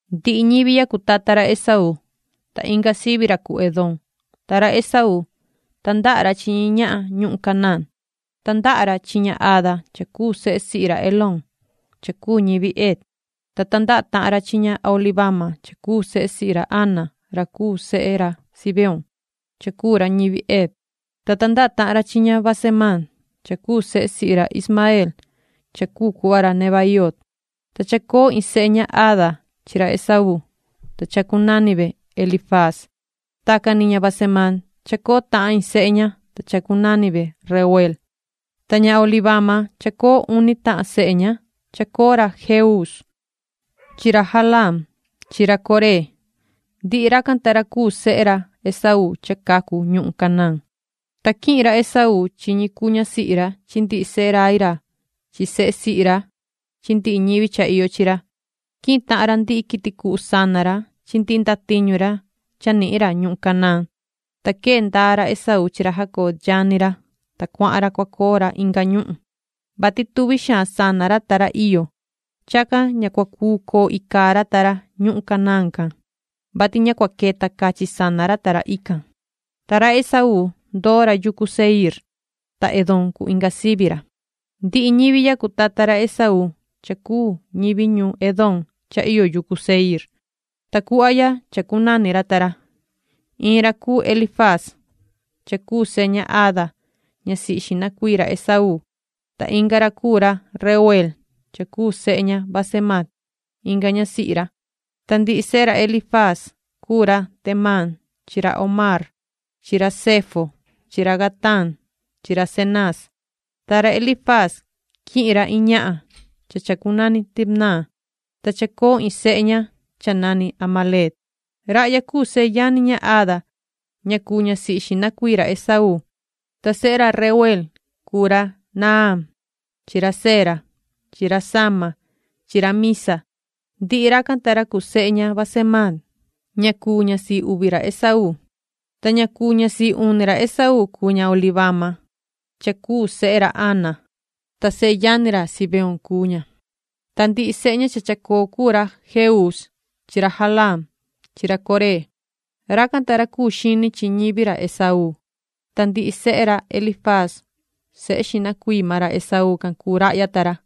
Ndihi ñivi ya cuu tata ra Esaú, ta inga sivi ra cuu Edom. Ta ra Esaú, tandaha ra chi ñi ñahan ñuhun Canaán. Tandaha ra chi ña Ada cha cuu sehe sihi ra Elón cha cuu ñivi Het, ta tandaha tahan ra chi ña Aholibama cha cuu sehe sihi ra Aná ra cuu sehe ra Zibeón cha cuu ra ñivi Hev, ta tandaha tahan ra chi ña Basemaat cha cuu sehe sihi ra Ismaeel cha cuu cuhva ra Nebaioot. Ta chacoo iin sehe ña Ada chi ra Esaú, ta chacunani ve Elifaaz. Tacan ni ña Basemaat chacoo tahan iin sehe ña, ta chacunani ve Reuel. Ta ña Aholibama, chacoo uni tahan sehe ña. Chacoo ra Jeuus chi ra Jalaam chi ra Coré. Ndihi racan ta ra cuu sehe ra Esaú cha cacu ñuhun Canaán. Ta quihin ra Esaú chi ñi cuu ñasihi ra chi ndihi sehe rai ra chi sehe sihi ra chi ndihi ñivi cha iyo chi ra. Quihin tahan ra ndihi quiti cuhu sana ra chi ndihi ndatiñu ra cha nihin ra ñuhun Canaán, ta quee ndaa ra Esaú chi ra Jacob yani ra, ta cuahan ra cua coo ra inga ñuhun, vati tuvi xaan sana ra ta ra iyo. Chacan ña cua cuu coo icaa ra ta ra ñuhun Canaán can, vati ña cua queta cachi sana ra ta ra ican. Ta ra Esaú ndoo ra yucu Seiir. Ta Edom cuu inga sivi ra. Ndihi ñivi ya cuu tata ra Esaú cha cuu ñivi ñuun Edom cha iyo yucu Seiir. Ta cuhva ya chacunani ra ta ra: Iin ra cuu Elifaaz cha cuu sehe ña Ada ñasihi xihna cuii ra Esaú, ta inga ra cuu ra Reuel cha cuu sehe ña Basemaat inga ñasihi ra. Ta sehe ra Elifaz cuu ra Temán chi ra Omar chi ra Zefo chi ra Gatam chi ra Cenaz. Ta chacoo inca ñasihi ra Elifaz cha chacunani Timna, ta chacoo iin sehe ña cha nani Amalec. Rahya cuu seyani ña Ada ña cuu ñasihi xihna cuii ra Esaú. Ta sehe ra Reuel cuu ra Nahaat chi ra Zera chi ra Sama chi ra Miza. Ndihi racan ta ra cuu sehe ña Basemaat ña cuu ñasihi uvi ra Esaú. Ta ña cuu ñasihi uni ra Esaú cuu ña Aholibama cha cuu sehe ra Anaa, ta seyani ra Zibeoon cuu ña, ta ndihi sehe ña cha chacoo cuu ra Jeuus chi ra Jalaam chi ra Coré. Racan ta ra cuu xini chi ñivi ra Esaú. Ta ndihi sehe ra Elifaaz sehe xihna cuii maan ra Esaú cuu rahya ta ra.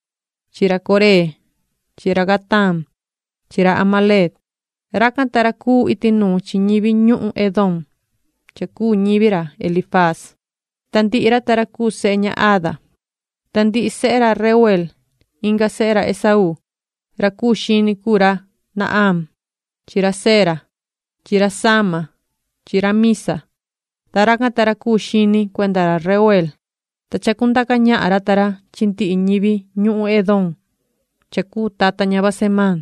chi ra Coré chi ra Gataam chi ra Amalec. Racan ta ra cuu iti nuun chi ñivi ñuhun Edom cha cuu ñivi ra Elifaaz, ta ndihi ra ta ra cuu sehe ña Ada. Ta ndihi sehe ra Reuel, inga sehe ra Esaú: Ra cuu xini cuu ra Nahaat chi ra Zera chi ra Sama chi ra Miza, ta racan ta ra cuu xini cuenda ra Reuel, ta chacundaca ñahan ra ta ra chi ndihi ñivi ñuhun Edom cha cuu tata ña Basemaat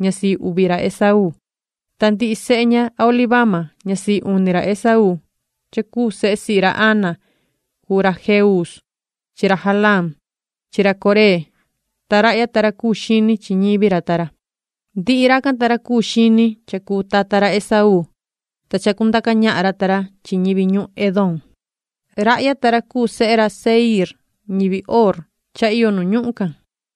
ñasihi uvi ra Esaú. Ta ndihi sehe ña Aholibama ñasihi uni ra Esaú cha cuu sehe sihi ra Anaa cuu ra Jeuus chi ra Jalaam chi ra Coré, ta rahya ta ra cuu xini chi ñivi ra ta ra. Ndihi racan ta ra cuu xini cha cuu tata ra Esaú, ta chacundaca ñahan ra ta ra chi ñivi ñuhun Edom. Rahya ta ra cuu sehe ra Seiir ñivi Hoor cha iyo nu ñuhun can: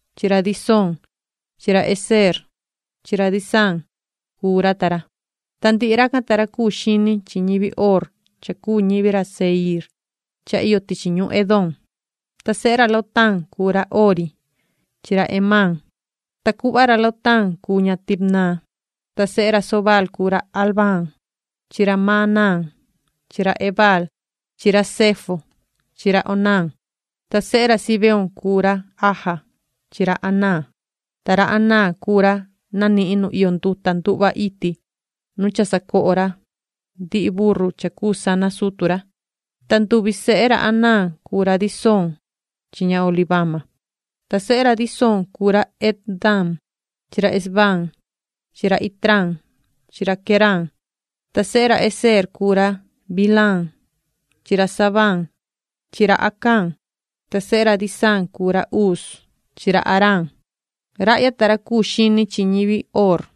chi ra Disoon chi ra Ezeer chi ra Disaan cuu ra ta ra. Ta ndihi racan ta ra cuu xini chi ñivi Hoor cha cuu ñivi ra Seiir cha iyo tichi ñuhun Edom. Ta sehe ra Lotaan cuu ra Hori chi ra Hemaam. Ta cuhva ra Lotaan cuu ña Timnat. Ta sehe ra Sobaal cuu ra Alvaan chi ra Manahaat chi ra Ebaal chi ra Sefo chi ra Onaam. Ta sehe ra Zibeoon cuu ra Aja chi ra Anaa. Ta ra Anaa cuu ra nanihin nu iyo nduta nduhva iti nu cha sacoho ra ndihi burru cha cuu sana sutu ra. Ta nduvi sehe ra Anaa cuu ra Disoon chi ña Aholibama. Ta sehe ra Disoon cuu ra Hemdaan chi ra Esbaan chi ra Itraan chi ra Queraan. Ta sehe ra Ezeer cuu ra Bilhaan chi ra Zavaan chi ra Acán. Ta sehe ra Disaan cuu ra Uz chi ra Araan. Rahya ta ra cuu xini chi ñivi Hoor: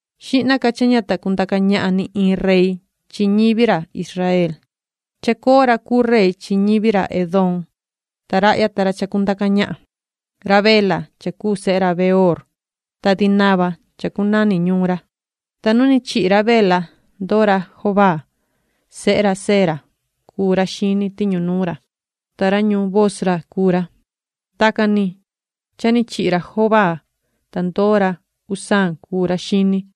Xihna ca cha ña ta cundaca ñahan ni iin rey chi ñivi ra Israel, chacoo rey chi ñivi ra Edom ta rahya ta ra chacundaca ñahan: Ra Bela cha cuu sehe ra Beoor, ta Dinaba chacunani ñuun ra. Ta nu ni chihi ra Bela ndoo ra Jobaab sehe ra Zera cuu ra xini tiñu nuun ra, ta ra ñuun Bosra cuu ra. Tacan ni cha ni chihi ra Jobaab, ta ndoo ra Husaam cuu ra xini,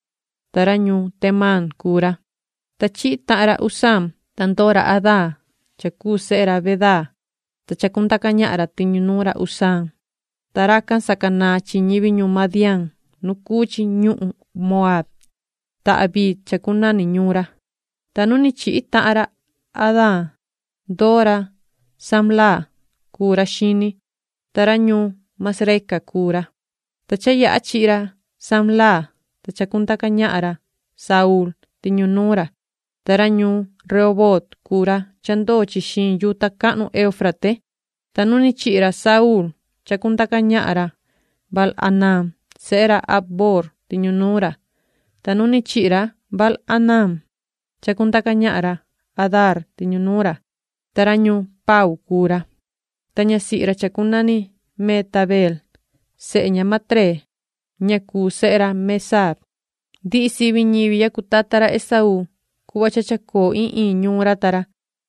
ta ra ñuun Temaan cuu ra. Ta chihi tahan ra Husaam, ta ndoo ra Hadaad cha cuu sehe ra Bedaad, ta chacundaca ñahan ra tiñu nuun ra Husaam, ta racan sacanaan chi ñivi ñuhun Madián nu cuu chi ñuhun Moaab, ta Aviit chacunani ñuun ra. Ta nu ni chihi tahan ra Hadaad ndoo ra Samlaa cuu ra xini, ta ra ñuun Masreca cuu ra. Ta cha yaha chihi ra Samlaa, ta chacundaca ñahan ra Saúl tiñu nuun ra, ta ra ñuun Rehoboot cuu ra cha ndoo chi xiin yuta cahnu Euufrate. Ta nu ni chihi ra Saúl, chacundaca ñahan ra Baal-hanaan sehe ra Acboor tiñu nuun ra. Ta nu ni chihi ra Baal-hanaan, chacundaca ñahan ra Hadaar tiñu nuun ra, ta ra ñuun Pau cuu ra, ta ñasihi ra chacunani Mehetabeel sehe ña Matreed ña cuu sehe ra Mezaab. Ndihi sivi ñivi ya cuu tata ra Esaú cuhva chacoo iin iin ñuun ra ta ra.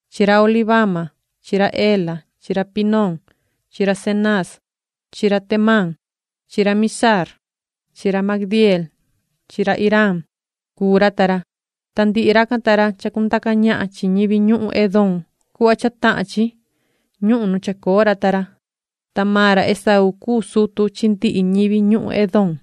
chi ra Aholibama chi ra Ela chi ra Pinoon chi ra Cenaaz chi ra Temaan chi ra Mibzaar chi ra Magdieel chi ra Iraam cuu ra ta ra. Ta ndihi racan ta ra chacundaca ñahan chi ñivi ñuhun Edom cuhva cha tahan chi ñuhun nu chacoo ra ta ra. Ta maan ra Esaú cuu sutu chi ndihi ñivi ñuhun Edom.